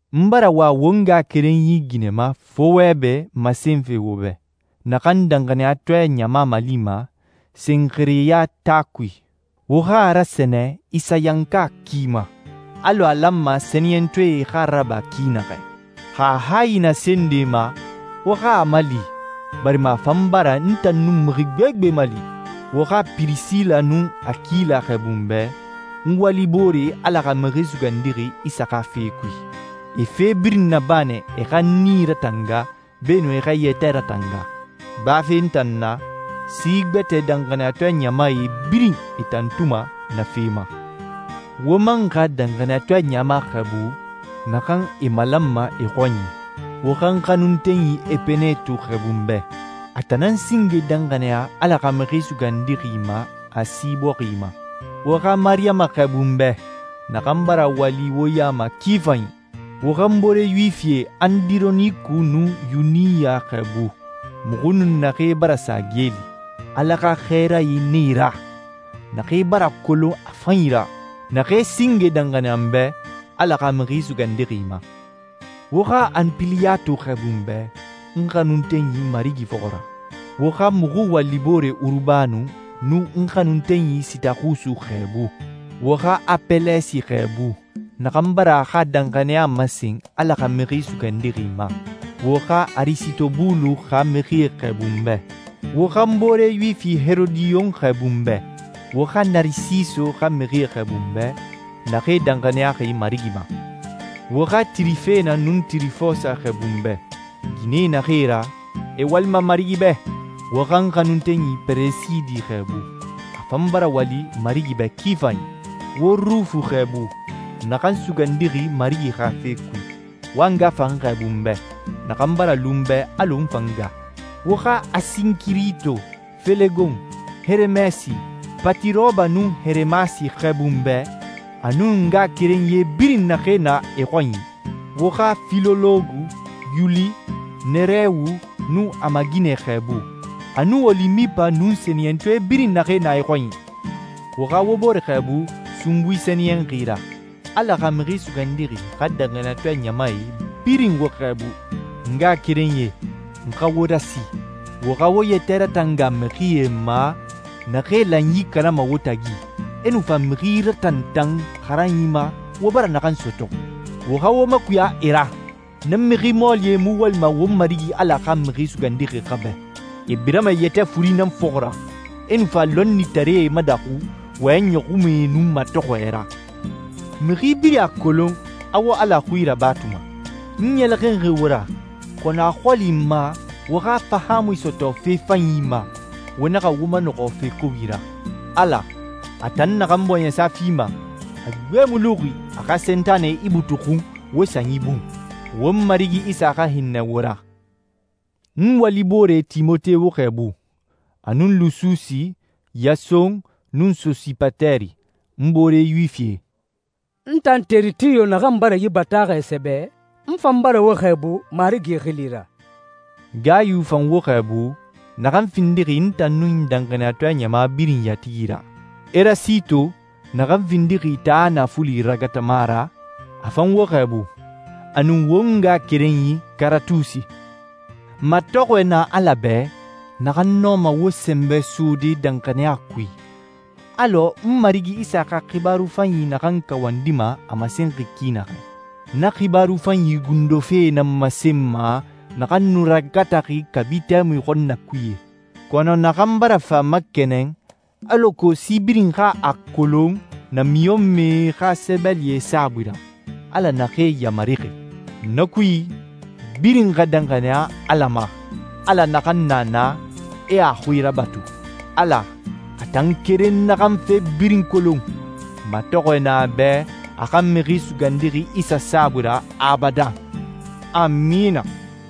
N bara wa won ngaxakerenyi ginɛma Fowebe masenfe wo bɛ, naxan danxaniyatɔɛ ɲama malima Senxereya taa kui. Wo xa a rasɛnɛ Isayanka ki ma, alɔ a lanma sɛniyɛntɔɛe xa a raba ki naxɛ. Xa a hayi na se nde ma, wo xa a mali, barima a fan bara n tan nun mixi gbegbe mali. Wo xa Pirisila nun Akila xɛɛbu n bɛ, n walibooree Ala xa Mixi Sugandixi Isa xa fe kui. E fe birin naba nɛ e xa n nii ratanga beenun e xa e yɛtɛ ratanga. Bafe n tan na, si gbɛtɛe danxaniyatɔɛ ɲamae birin e tantuma na fe ma. Wo man xa danxaniyatɔɛ ɲama xɛɛbu naxan e malanma e xɔnyi. Wo xa n xanuntenyi Epeneto xɛɛbu n bɛ. A tan nan singe danxaniya Ala xa Mixi Sugandixi ma Asi bɔxi ma. Wo xa Mariyama xɛɛbu n bɛ, naxan bara wali wo ya ma ki fanyi. Wo xa n boore Yuwifie Andironiku nun Yuniya xɛɛbu, muxu nun naxee bara sa geeli. Ala xa xɛɛrae nan e ra, naxee bara kolon a fanyi ra, naxee singe danxaniya n bɛ Ala xa Mixi Sugandixi ma. Wo xa Anpiliyatu xɛɛbu n bɛ, n xanuntenyi Marigi fɔxɔ ra. Wo xa muxu waliboore Urubano nun n xanuntenyi Sitaxusi xɛɛbu. Wo xa Apɛlɛsi xɛɛbu, naxan bara a xa danxaniya masen Ala xa Mixi Sugandixi ma. Wo xa Arisitobulo xa mixie xɛɛbu n bɛ. Wo xa n boore Yuwifi Herodiyon xɛɛbu n bɛ. Wo xa Narisiso xa mixie xɛɛbu n bɛ, naxee danxaniyaxi Marigi ma. Wo xa Tirifena nun Tirifosa xɛɛbu n bɛ. Ginɛe naxee e ra, e walima Marigi bɛ. Wo xa n xanuntenyi Peresidi xɛɛbu. A fan bara wali Marigi bɛ ki fanyi. Wo Rufu xɛɛbu, naxan sugandixi Marigi xa fe kui. Wo a nga fan xɛɛbu n bɛ, naxan bara lu n bɛ alɔ n fan nga. Wo xa Asinkirito, Felegon, Heremɛsi, Patiroba, nun Heremasi xɛɛbu n bɛ, a nun ngaxakerenyie birin naxee na e xɔnyi. Wo xa Filologo, Yuli, Nerewu nun a maaginɛ xɛɛbu, a nun Olimipa nun sɛniyɛntɔɛ birin naxee na e xɔnyi. Wo xa wo bore xɛɛbu sunbui sɛniyɛnxi ra. Ala xa Mixi Sugandixi xa danxaniyatɔɛ ɲamae birin wo xɛɛbu. N ngaxakerenyie, n xa wo rasi, wo xa wo yɛtɛ ratanga mixie ma, naxee lanyi kanama wo tagi, e nu fa mixi ratantan xaranyi ma wo bara naxan sɔtɔ. Wo xa wo makuya e ra. Na mixi mɔɔlie mu walima won Marigi Ala xa Mixi Sugandixi xa bɛ. E birama e yɛtɛ furi nan fɔxɔ ra, e nu fa lɔnnitaree madaxu wɔyɛn ɲɔxunmɛe nun matɔxɔɛ ra. Mixi birin a kolon a wo Ala xui rabatuma. N ɲɛlɛxinxi wo ra, kɔnɔ a xɔli n ma wo xa fahaamui sɔtɔ fe fanyi ma, wo naxa wo manɔxɔ fe kobi ra. Ala, a tan naxan bɔɲɛsa fima, a gbe mu luxi a xa Sentanɛ ibutuxun wo sanyi bun. Won Marigi Isa xa hinnɛ wo ra. N waliboore Timote wo xɛɛbu, a nun Lususi, Yason, nun Sosipateri, n boore Yuwifie. N tan Teritiyo naxan bara yi bataaxɛ sɛbɛ, n fan bara wo xɛɛbu Marigi xili ra. Gayu fan wo xɛɛbu, naxan findixi n tan nun danxaniyatɔɛ ɲama birin yatigi ra. Erasito, naxan findixi taa naafuli ragatama ra, a fan wo xɛɛbu, a nun won ngaxakerenyi Karatusi. Matɔxɔɛ na Ala bɛ, naxan nɔma wo sɛnbɛ sode danxaniya kui, alɔ n Marigi Isa xa xibaaru fanyi naxan kawandima a masenxi ki naxɛ. Na xibaaru fanyi gundo fe nan masenma naxan nu ragataxi kabi tɛmui xɔnnakuye, kɔnɔ naxan bara fa makɛnɛn alako si birin xa a kolon namiɲɔnmɛe xa sɛbɛlie saabui ra, Ala naxee yamarixi. Na kui, birin xa danxaniya Ala ma, Ala naxan na na, e a xui rabatu. Ala, a tan keren naxan fe birin kolon, matɔxɔɛ na a bɛ a xa Mixi Sugandixi Isa saabui ra abadan. Amina!